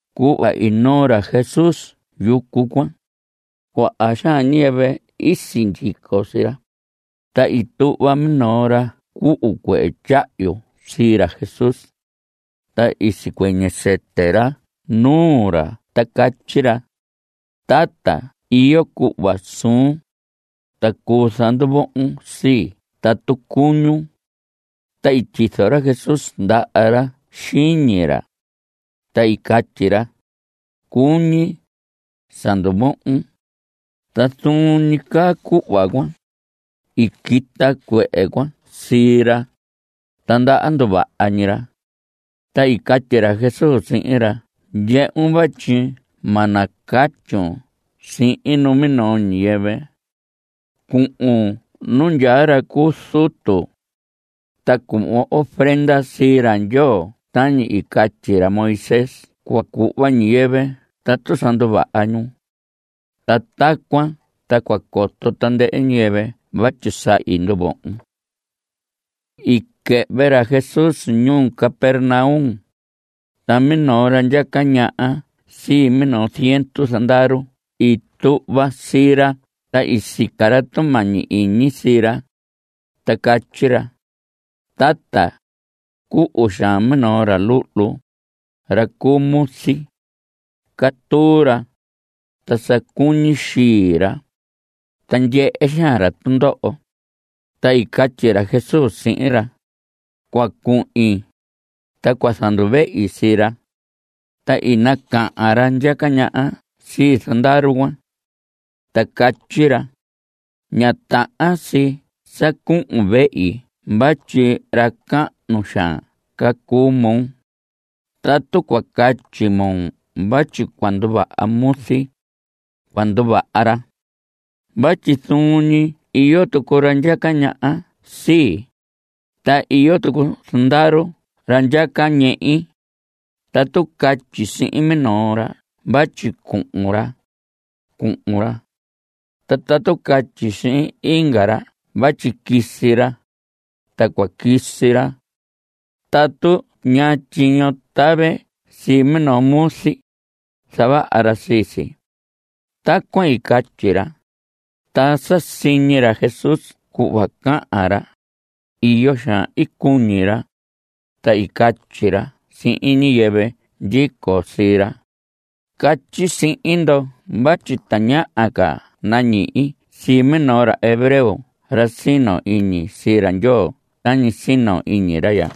Cuhva i noo ra Jesús yucu cuan, cuaha xaan ñiyɨvɨ i sindyico sii ra. Ta i tuhva minoo ra cuhu cuehe tyahyu sii ra Jesús. Ta i sicuɨñɨ sɨtɨ ra nuu ra ta catyi ra: Tata, iyo cuhva suun, ta cuu zanduvohon sii tatu cuñun. Ta i tyizo ra Jesús ndaha ra xiñi ra, ta i catyi ra: Cuñi. Sa nduvohon. Ta zuun ñi caa cuhva cuan, i quita cuehe cuan sii ra, ta ndaha nduvaha ñi ra. Ta i catyi ra Jesús sihin ra: Ndyehun vatyi ma nacatyun sihin numinoo ñiyɨvɨ. Cuhun nu ndyaa ra cu zutu, ta cuhvon ofrenda sii ra Ndyoo tañi i catyi ra Moisés cua cuhva ñiyɨvɨ tatu sa nduvaha ñu. Ta tacuan ta cua coto tandɨhɨ ñiyɨvɨ vatyi sa i nduvohon. I quɨhvɨ ra Jesús ñuu Capernaum, ta minoo ra ndyaca ñaha sii minoo ziendu zandaru i tuhva sii ra ta i sica ra tumañi iñi sii ra, ta catyi ra: Tata, cuhu xaan minoo ra luhlu, ra cu muzi. Catuu ra, ta sa cuñi xii ra, ta ndyehe xaan ra tundoho. Ta i catyi ra Jesús sihin ra: Cua cuhin, ta cua zanduvehi sii ra. Ta i nacahan ra ndyaca ñaha sii zandaru cuan, ta i catyi ra: Ña tahan si sa cuhun vehi vatyi ra cahnu xaan ca cuu moo. Tatu cua catyi moo vatyi cua nduvaha muzi, cua nduvaha ra. Vatyi zuun ñi iyo tucu ra ndyaca ñaha sii, ta iyo tucu zandaru ra ndyaca ñehi. Tatu catyi sihin minoo ra vatyi cuhun ra, cuhun ra. Ta tatu catyi sihin inga ra vatyi quisi ra, cua quisi ra. Ta tatu ñaa tyiño tave sii minoo muzi, zavaha ra sii si. Tacuan i catyi ra, ta sa siñi ra Jesús cuhva cahan ra, iyo xaan i cuñi ra, ta i catyi ra sihin ñiyɨvɨ ndyico sii ra: Catyi sihin ndo vatyi tañaha ca nañihi sii minoo ra hebreo ra sino iñi sii ra Ndyoo tañi sino iñi ra ya.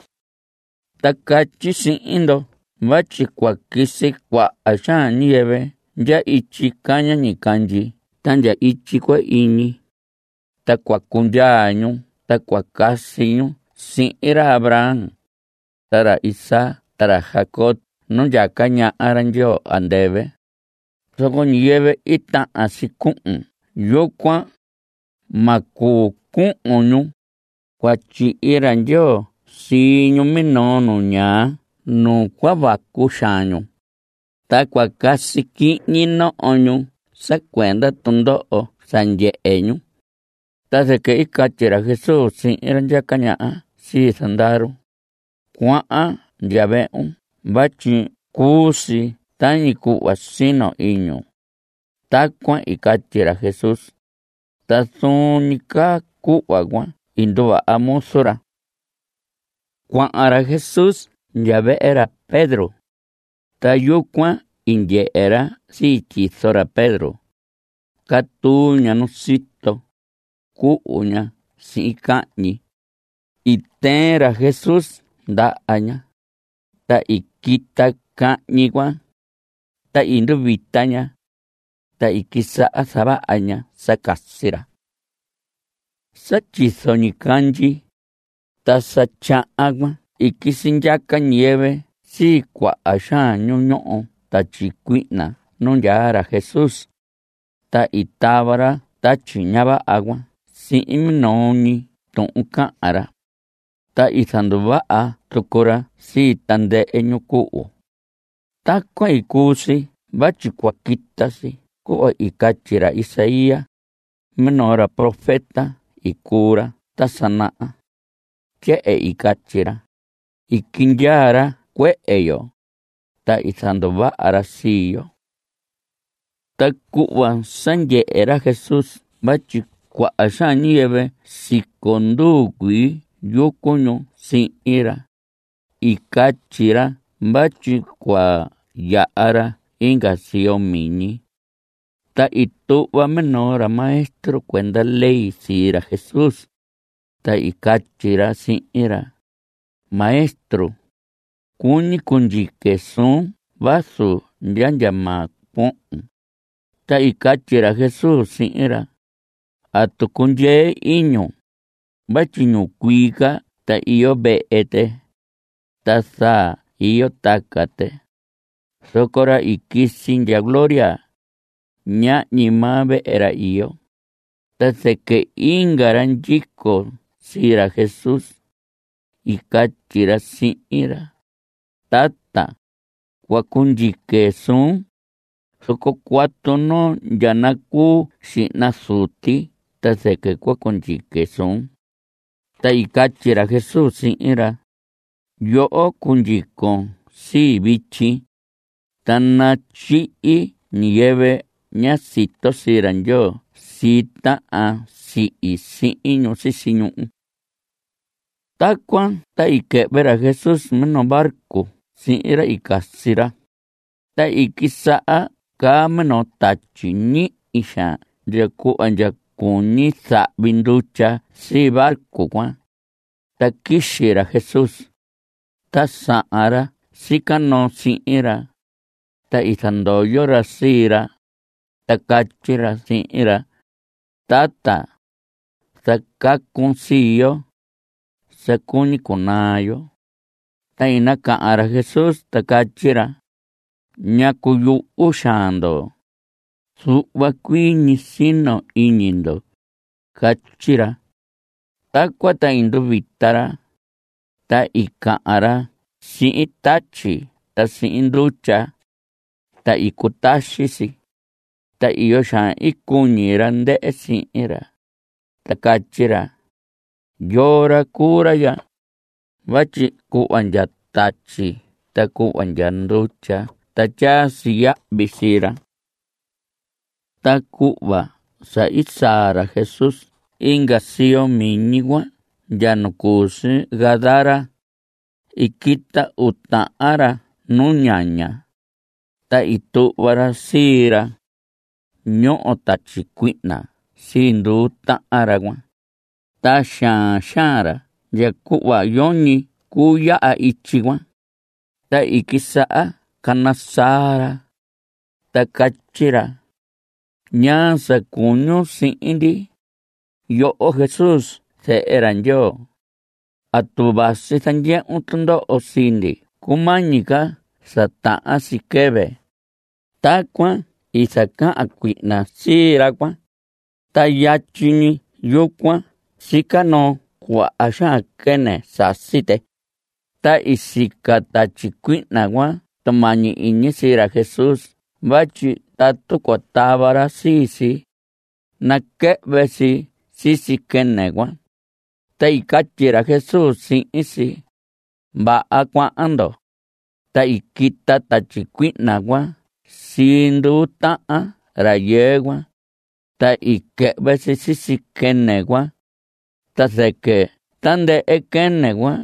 Ta catyi sihin ndo vatyi cua quisi cuaha xaan ñiyɨvɨ ndya ityi caña ñicandyi ta ndya ityi cua iñi, ta cua cundyaa ñu ta casi ñu sihin ra Abraham, ta ra Isaac ta ra Jacob nu ndyaca ñaha ra Ndyoo andɨvɨ. Zoco ñiyɨvɨ i tahan si cuhun yucuan, ma cuu cuhun ñu. Cua tyihi ra Ndyoo sii ñu minoo nu ñaa nu cua vacu xaan ñu, ta cua casi quihñi noho ñu sa cuenda tundoho sa ndyehe ñu. Ta zɨquɨ i catyi ra Jesús sihin ra ndyaca ñaha sii zandaru: Cuahan ndya vehun vatyi cuu si tañi cuhva sino iñun. Tacuan i catyi ra Jesús, ta zuun ñi caa cuhva cuan i nduvaha muzu ra. Cuahan ra Jesús ndya vehe ra Pedro, ta yucuan i ndyehe ra sii tyizo ra Pedro. Catuu ña nu sito. Cuhu ña sihin cahñi. I tɨɨn ra Jesús ndaha ña, ta i quita cahñi cuan. Ta i nduvita ña, ta i quisaha zavaha ña sa casi ra. Sa tyizo ñicandyi, ta sa tyahan cuan i quisi ndyaca ñiyɨvɨ sii cuaha xaan ñu ñoho tatyi cuihna nu ndyaa ra Jesús. Ta i tava ra tatyi ña vaha cuan sihin minoo ñi tuhun cahan ra, ta i zanduvaha tucu ra sii tandɨhɨ ñu cuhu. Tacuan i cuu si vatyi cua quita si cuhva i catyi ra Isaías; minoo ra profeta i cuu ra ta sa naha. Tyehen i catyi ra: “I quindyaa ra cuehe yo, ta i zanduvaha ra sii yo.” Ta cuhva sa ndyehe ra Jesús vatyi cuaha xaan ñiyɨvɨ siconduu cuii yucu ñu sihin ra, i catyi ra vatyi cua yaha ra inga siyo miñi. Ta i tuhva minoo ra maestro cuenda ley sii ra Jesús, ta i catyi ra sihin ra: Maestro, cuñi cundyique suun vazu ndya ndya maa cuohon. Ta i catyi ra Jesús sihin ra: ¿Atu cundyee iñun? vatyi ñicuii ca ta iyo vehe tɨ, ta zaa iyo taca tɨ. Zoco ra i quisi ndya gloria, ñahñi maa vehe ra iyo. Ta zɨquɨ inga ra ndyico sii ra Jesús, i catyi ra sihin ra: Tata, cua cundyique suun, zoco cuatu noo ndya nacuu xihna zuti ta zɨquɨ cua cundyique suun. Ta i catyi ra Jesús sihin ra: Yoho cundyicon sii vityi, ta natyihi ñiyɨvɨ ña sito sii ra Ndyoo sii tahan sihi sihin ñu sisi ñuhu. Tacuan ta i quɨhvɨ ra Jesús minoo barco sihin ra i casi ra. Ta i quisaha caa minoo tatyi ñihi xaan ndya cuhva ndya cuñi zahvi ndutya sii barco cuan. Ta quixi ra Jesús. Ta sahan ra sica noo sihin ra, ta i zandoyo ra sii ra, ta catyi ra sihin ra: ¡Tata, zacacun sii yo; sa cuñi cunaa yo! Ta i nacahan ra Jesús, ta catyi ra: ¿Ñacu yuhu xaan ndo? Zuhva cuii ñi sino iñi ndo. Catyi ra. Tacuan ta i nduvita ra, ta i cahan ra sihin tatyi ta sihin ndutya, ta i cutaxi si. Ta iyo xaan i cuñi ra ndɨhɨ sihin ra, ta catyi ra: ¿Yoo ra cuu ra ya? vatyi cuhva ndya tatyi ta cuhva ndya ndutya ta tyaa si yahvi sii ra. Ta cuhva sa i saa ra Jesús inga siyo miñi cuan ndya nu cu si Gadara, i quita uu tahan ra nu ñaña, ta i tuhva ra sii ra. Ñoho tatyi cuihna sii nduu tahan ra cuan, ta xaan xaan ra ndya cuhva yoñi cuu yaha ityi cuan. Ta i quisaha cana saa ra, ta catyi ra: ¿Ñaa sa cuñun sihin ndi, yoho Jesús zehe ra Ndyoo? ¿Atu vasi zandyehun tundoho sii ndi cumañi ca sa tahan si quɨvɨ? Tacuan i zacahan cuihna sii ra cuan. Ta yatyi ñi yucuan sica noo cuaha xaan quɨnɨ. Sasi tɨ. Ta i sica tatyi cuihna cuan tumañi iñi sii ra Jesús vatyi tatu cua tava ra sii si, naquɨhvɨ si sisi quɨnɨ cuan. Ta i catyi ra Jesús sihin si: Vaha, cuahan ndo. Ta i quita tatyi cuihna sii nduu tahan rayɨɨ cuan, ta i quɨhvɨ si sisi quɨnɨ cuan. Ta zɨquɨ tandɨhɨ quɨnɨ cuan,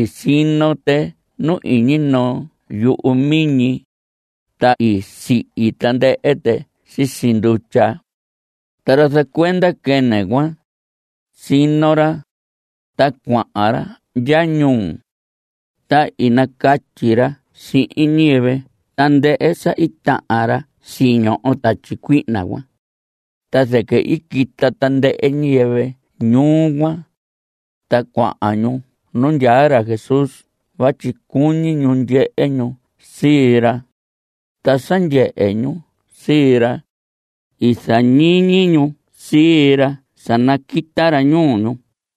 i sino tɨ nu iñi noo yuhu miñi, ta i sihi tandɨhɨ tɨ sisi ndutya. Ta ra zacuenda quɨnɨ cuan, i sino ra, ta cuahan ra ndya ñuu, ta i nacatyi ra sihin ñiyɨvɨ tandɨhɨ sa i tahan ra siñoho tatyi cuihna cuan. Ta zɨquɨ i quita tandɨhɨ ñiyɨvɨ ñuu cuan, ta cuahan ñu nu ndyaa ra Jesús vatyi cuñi ñu ndyehe ñu sii ra. Ta sa ndyehe ñu sii ra, i zañiñi ñu sii ra sa naquita ra ñuu ñu.